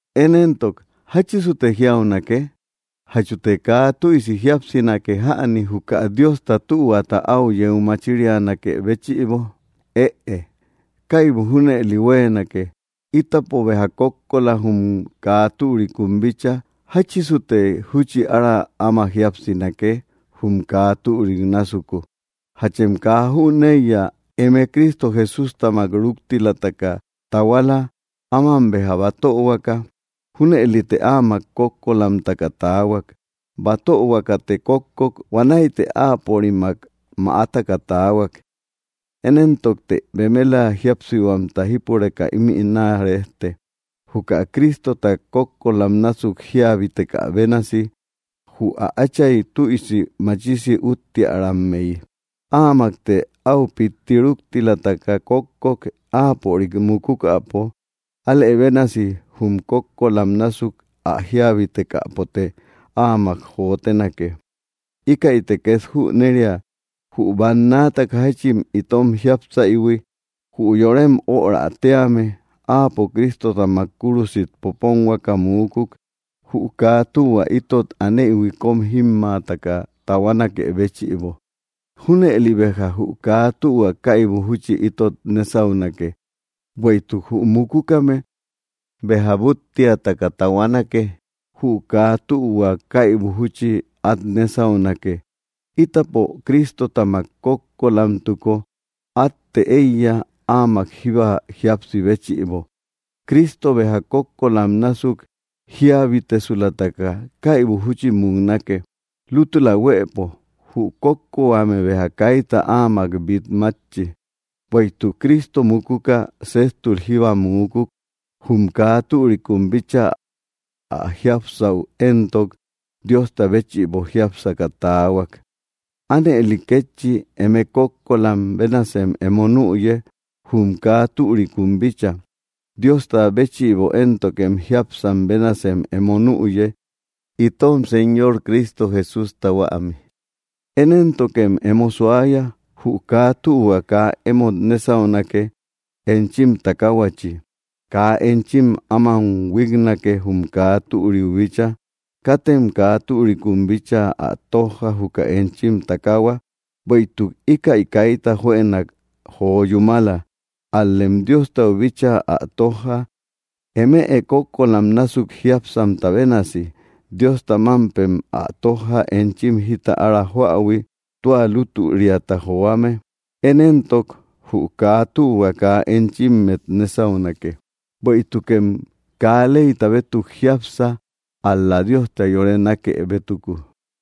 Én éntok, ¿jáchisute jiaunake? ¿Jachute kaa tüisi jíapsinake jäni, juka Diosta tühuata áu yeu machirianakë béchïbo? ¡Ëe! ¡Kaibu junëli huéenake! Ítapo béja kókkola jum kaa türikun bícha; ¿jáchisute júchi ára áma jíapsinake, jum kaa türik násuku? ¿Jachem kaa jüneiya, eme Cristo Jesústamak ruktilataka tahuala, áman béja batöhuaka? Júnëlite áamak kókkolamtaka taahuak. Batöhuakate kókkok; huanäite áapörimak mäataka taahuak. Én éntokte bemela jíapsihuamta jípureka ímï naa rejte, juka Cristota kókkolam násuk jíabitekä bénasi, jü ä Átchay tüisi machisi úttiärammeyi. Áamakte áu pitti ruktilataka kókkok, áapörik mukukäpo; alë bénasi jum kókkolam násuk ä jíabitekäpote áamak jotenake. Íkäite két jüneria, jü bannaataka jáchin itom jiápsaïhui, jü yorem öra tíame, áapo Cristotamak kúrusit poponhuakä muukuk, jü kaa tühua itot aneïhui kóm jímmaataka tahuanakë béchïbo. Júnëli béja jü kaa tühua kaibu júchi itot nésaunake. Bueïtuk jü mukukame béja búttiakata tahuanake; jü kaa tühua kaibu júchi át nésaunake. Ítapo Cristotamak kókkolamtuko, átte éiya, áamak jíba jíapsi béchïbo. Cristo béja kókkolam násuk jíabitesulataka, kaibu júchi muknake. Lútula huëpo, jü kókkohuame béja kaita áamak bít mátchi. Bueïtuk Cristo mukuka, séjtul jíbba muukuk, jum kaa türikun bícha; ä jiápsaü éntok, Diosta béchïbo jiápsaka taahuak. Ánëli kétchi, eme kókkolam bénasem emo nüye, jum kaa türikun bícha; Diosta béchïbo éntokem jiápsam bénasem emo nüye, itom Señor Cristo Jesústa huämi. Én éntokem emo suaya. Jü kaa tühua kaa emót nésaunake, enchim takaahuachi. Kaa enchim áman huíknake, jum kaa türiu bícha. Katem kaa türikum bíchaa ä tójja, juka enchim takaahua, bueïtuk íkäi kaita juënak jo yúmala. Ál‑lem Diostau bíchaa ä tójja, eme kókkolam násuk jiápsamta bénasi. Diosta mámpem ä tójja, enchim jita ára joähui, tua lútüriata joame. Én éntok jü kaa tühua kaa enchimmet nésaunake; bueïtukem kaa leyta bétuk jiápsa, ál‑la Diosta yore nákë bétuku.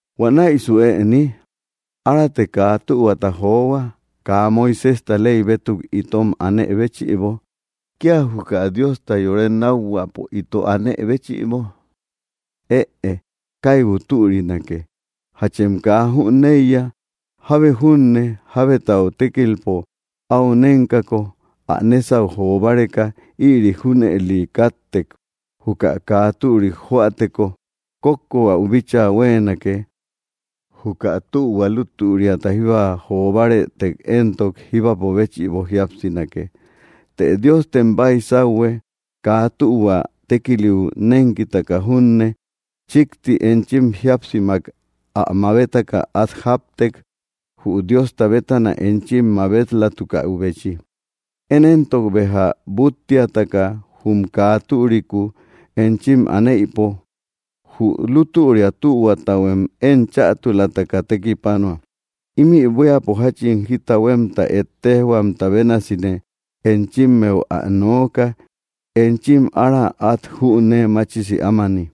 ¿Huanäisu ëni? ¿Arate kaa tühuata johua, kaa Moiséjta ley bétuk itom anë béchïbo, kía juka Diosta yore nákhuäpo ito anë béchïbo? ¡Ëe! ¡Kaibu türinake! ¿Jachem kaa jüneiya? Jábe junne jábetau tékilpo áu nénkako ä nésau jo báreka, ïri junëli káttek. Juka kaa türik joäteko kókkohuäu bíchaa huéenake. Juka tühua lutüriata jíba jo bárëtek éntok, jíbapo béchïbo jíapsinake. Të Diostem baisauhue, kaa tühua tékiliu nénkitaka junne, chíkti enchim jíapsimak ä mabetaka at jáptek, jü Diosta bétana enchim mabet‑latukäbechi. Én éntok béja búttiataka jum kaa türiku enchim aneïpo, jü lutüria tühuatahuem én chätulataka tekipanua. (Ímï buíapo jáchin jita huémta ettejhuamta bénasine enchimmeu ä nooka, enchim ára át jünee machisi ámani.)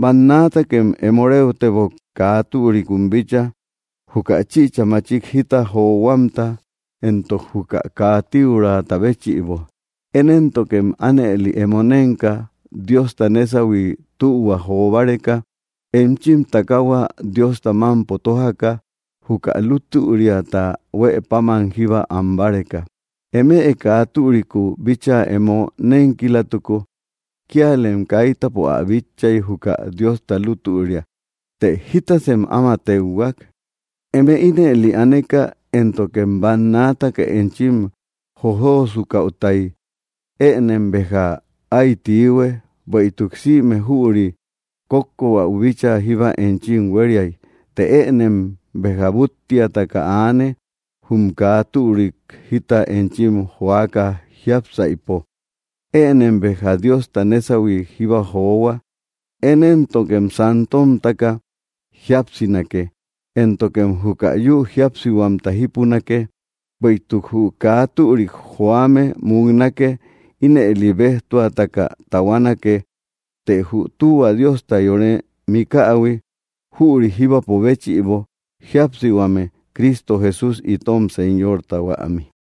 Bannaatakem emo réutebok, kaa türikum bícha, juka chïcha machik jita johuamta entok juka kaa tíuraata béchïbo. Én éntokem ánëli emo nénka, Diosta nésahui tühua jo báreka, enchim takaahua Diosta mámpo tójaka, juka lutüriata huë páman jíba am báreka. Eme kaa türiku bíchaa emo nénkilatuko, kíalem kaitapo ä bitchay, jükä Diosta lútüria. Të, ¿jitasem áma téuhuak? Eme ínëli aneka éntokem bannaataka enchim jojosukaütay, ënem béja áy tiihue. Bueïtuk sïme jüri kókkohuäu bíchaa jíba enchim huériay. Të ënem béja búttiataka aane, jum kaa türik jita enchim joaka jiápsaïpo. Ënem béja Diosta nésahui jíba johua. Én éntokem santomtaka jíapsinake, éntokem juka yü jiápsihuamta jípunake. Bueïtuk jü kaa türik joame muknake; ínëli béjtuataka tahuanake. Të jü tühua Diosta yore mikähui, jüri jíbapo béchïbo jíapsihuame, Cristo Jesús itom Señorta huämi.